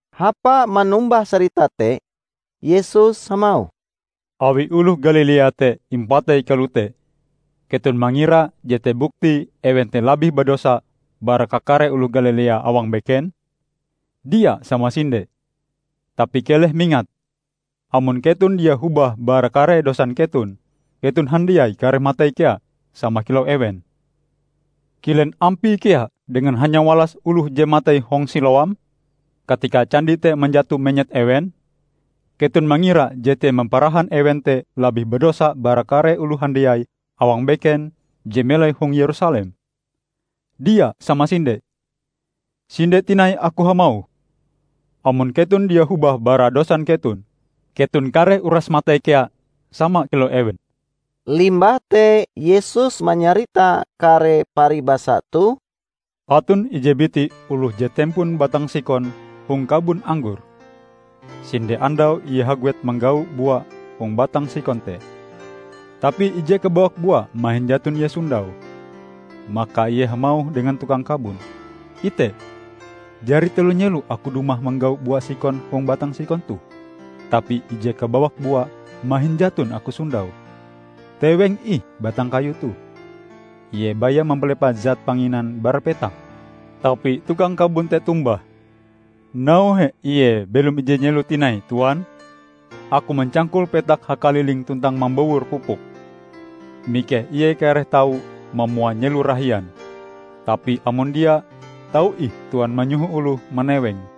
Hapa manombah sarita te, Yesus hamauh, "Awi oloh Galilea te impatei kalote, keton mangira jete buktie ewen te labih badosa bara kakare oloh Galilea awang beken? Dia samasinde! Tapi keleh mingat: amon keton dia hobah bara kare dosan keton, keton handiai kareh matei kea, sama kilau ewen. Kilen ampie kea dengan hanyawalas oloh je matei hong Siloam, katika candi te manjato menyet ewen? Keton mangira jete mamparahan ewen te labih badosa bara kare oloh handiai awang beken je melai hong Yerusalem? Dia samasinde! Sinde tinai Aku hamauh: Amon keton dia hobah bara dosan keton, keton kareh uras matei kea sama kilau ewen." Limbah te Yesus manyarita kare paribasa toh, "Aton ije biti oloh je tempon batang sikon hong kabon anggor. Sinde andau ie haguet manggau bua hong batang sikon te, tapi ije kabawak bua mahin jaton ie sondaue. Maka ie hamauh dengan tukang kabon, 'Ite, jari telo nyelo aku dumah manggau bua sikon hong batang sikon toh, tapi ije kabawak bua mahin jaton aku sondaue. Teweng ih batang kayu toh! Ie baya mampalepah zat panginan bara petak!' Tapi tukang kabon te tombah, 'Nauhe ie belom ije nyelo tinai, Tuan. Aku mancangkul petak hakalilinge tuntang mambowor pupuk. Mikeh ie kareh tau mamua nyelo rahian. Tapi amon dia, tau ih Tuan manyoho oloh manewenge.' "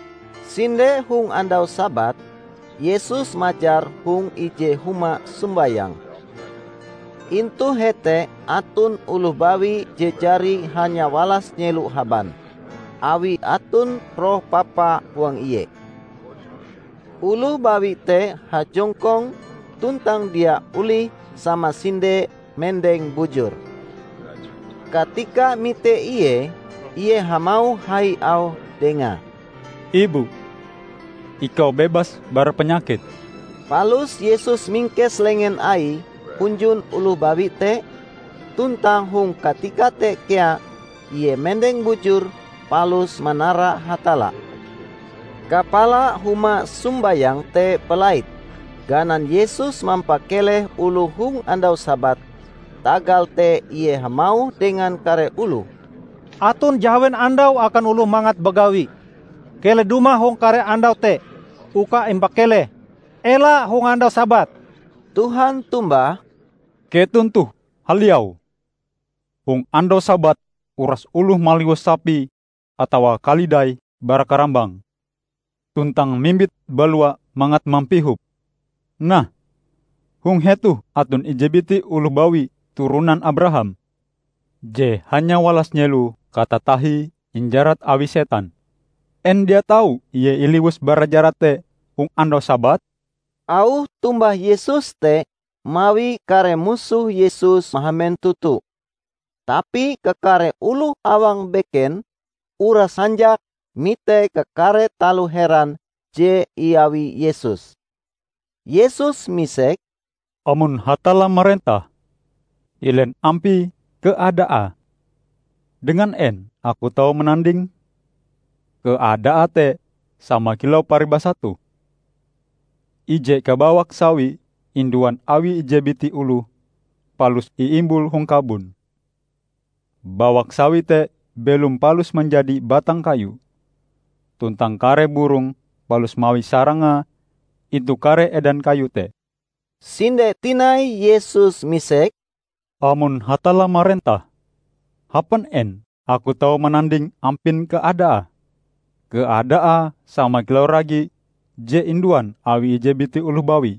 Sinde hong andau Sabat, Yesus majar hong ije huma sombayang. Intu hete aton oloh bawi je jari hanyawalas nyelo haban, awi aton roh papa huang ie. Oloh bawi te hajongkong tuntang dia olih samasinde mendeng bujur. Katika mite ie, ie hamauh hai auhe dengae, "Ibu, ikau bebas bara panyakitm!" Palus Yesus mingkes lengen Aie hunjun oloh bawi te, tuntang hong katika te kea ie mendeng bujur palus manara Hatalla. Kapala huma sombayang te balait, ganan Yesus mampakeleh oloh hong andau Sabat, tagal te ie hamauh dengan kare oloh, "Aton jahawen andau akan oloh mangat bagawi; keleh dumah hong kare andau te uka impakeleh, ela hong andau Sabat!" Tuhan tombah, "Keton toh haliau! Hong andau Sabat uras oloh maliwus sapi atawa kalidaie bara karambang tuntang mimbite balua mangat mampihope. Nah, hong hetoh aton ije biti oloh bawi turonan Abraham, je hanya walas nyelo katatahie injarat awi setan. En dia tau ie iliwus bara jarat te hong andau Sabat?" Auh tombah Yesus te mawi kare musoh Yesus mahamen toto; tapi kakare oloh awang beken uras hanjak mite kakare taloh heran je iawi Yesus. Yesus misek, "Amon Hatalla marentah, kilen ampie keadaae? Dengan en Aku tau manandinge? Keadaae te sama kilau paribasa toh. Ije kabawak sawi induan awi ije biti oloh palus iimbul hong kabon. Bawak sawi te belom palus manjadi batang kayu, tuntang kare burong palus mawi sarangae intu kare edan kayu te." Sinde tinai Yesus misek, "Amon Hatalla marentah, hapan en Aku tau mananding ampin keadaae? Keadaae sama kilau ragi je induan awi ije biti oloh bawi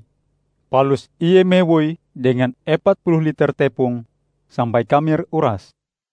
palus ie mawoie dengan epat puluh liter tepong, sampai kamer urase."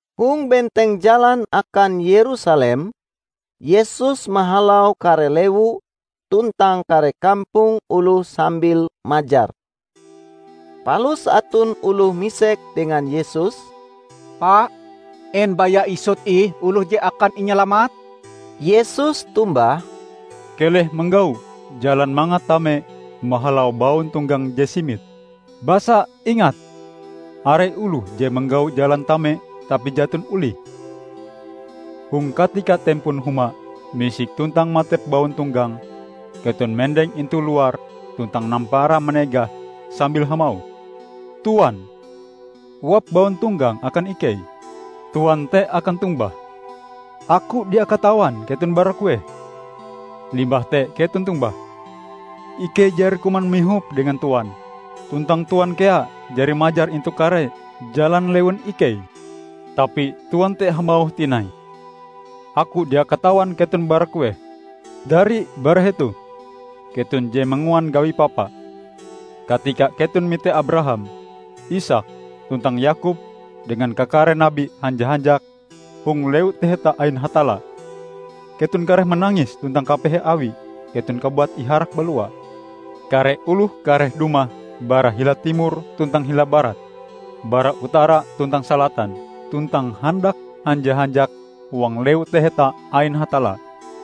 Hong benteng jalan akan Yerusalem, Yesus mahalau kare lewu tuntang kare kampong oloh sambil majar. Palus aton oloh misek dengan Yesus, "Pa, en baya isut ih oloh je akan inyalamat?" Yesus tombah, "Keleh manggau jalan mangat tame mahalau bauntonggang je simit. Basa, ingat! Are oloh je manggau jalan tame tapi jaton olihe. Hong katika tempon huma misik tuntang matep bauntonggange keton mendeng intu luar tuntang nampara manegah sambil hamauh, 'Tuan, uap bauntonggang akan ikei!' Tuan te akan tombah, 'Aku dia katawan keton bara kueh!' Limbah te keton tombah, 'Ikei jari kuman mihop dengan Tuan, tuntang Tuan kea jari majar intu kare jalan lewun ikei!' Tapi Tuan te hamauh tinai, 'Aku dia katawan keton bara kueh. Dari bara hetoh, keton je manguan gawi papa!' Katika keton mite Abraham, Isaak tuntang Yakob dengan kakare nabi hanja-hanjak hong lewu taheta ain Hatalla, keton kareh manangis tuntang kapehe awi keton kabuat iharak balua! Kare oloh kareh dumah bara hila timor tuntang hila barat, bara utara tuntang salatan, tuntang handak hanja-hanjak huang Lewu Taheta ain Hatalla.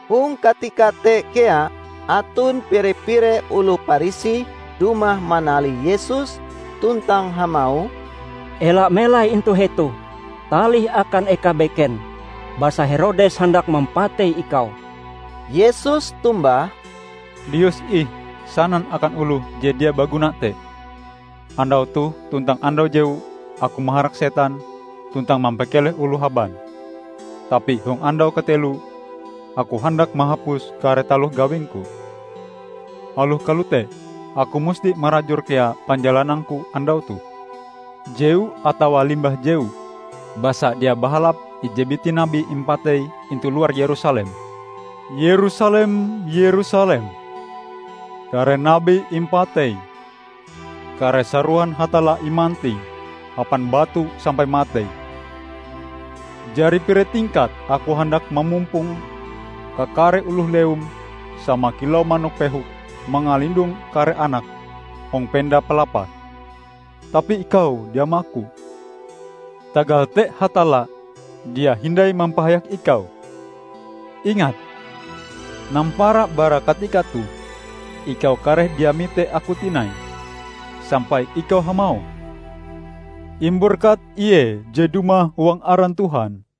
Hong katika te kea aton pire-pire oloh Parisi dumah manalih Yesus tuntang hamauh, "Ela melai intu hetoh! Talih akan eka beken, basa Herodes handak mampatei Ikau." Yesus tombah, "Lius ih sanan akan oloh je dia baguna te, 'Andau toh tuntang andau jewu Aku maharak setan tuntang mampakeleh oloh haban tapi hong andau kateloe, Aku handak mahapus kare taloh gawing-Ku.' Aloh kalote Aku musti marajur kea panjalanang-Ku andau toh, jewu atawa limbah jewu, basa dia bahalap ije biti nabi impatei intu luar Yerusalem. Yerusalem, Yerusalem! Kare nabi impateim! Kare sarohan Hatalla imantingm hapan batu sampai matei! Jari pire tingkat Aku handak mamumpong kakare oloh lewum sama kilau manok pehok mangalindong kare anake hong penda palapase, tapi ikau dia maku! Tagal te Hatalla dia hindai mampahayak Ikau. Ingat, nampara bara katika toh Ikau kareh dia mite Aku tinai, sampai Ikau hamauh, 'Imberkat Ie je dumah huang aran Tuhan.' "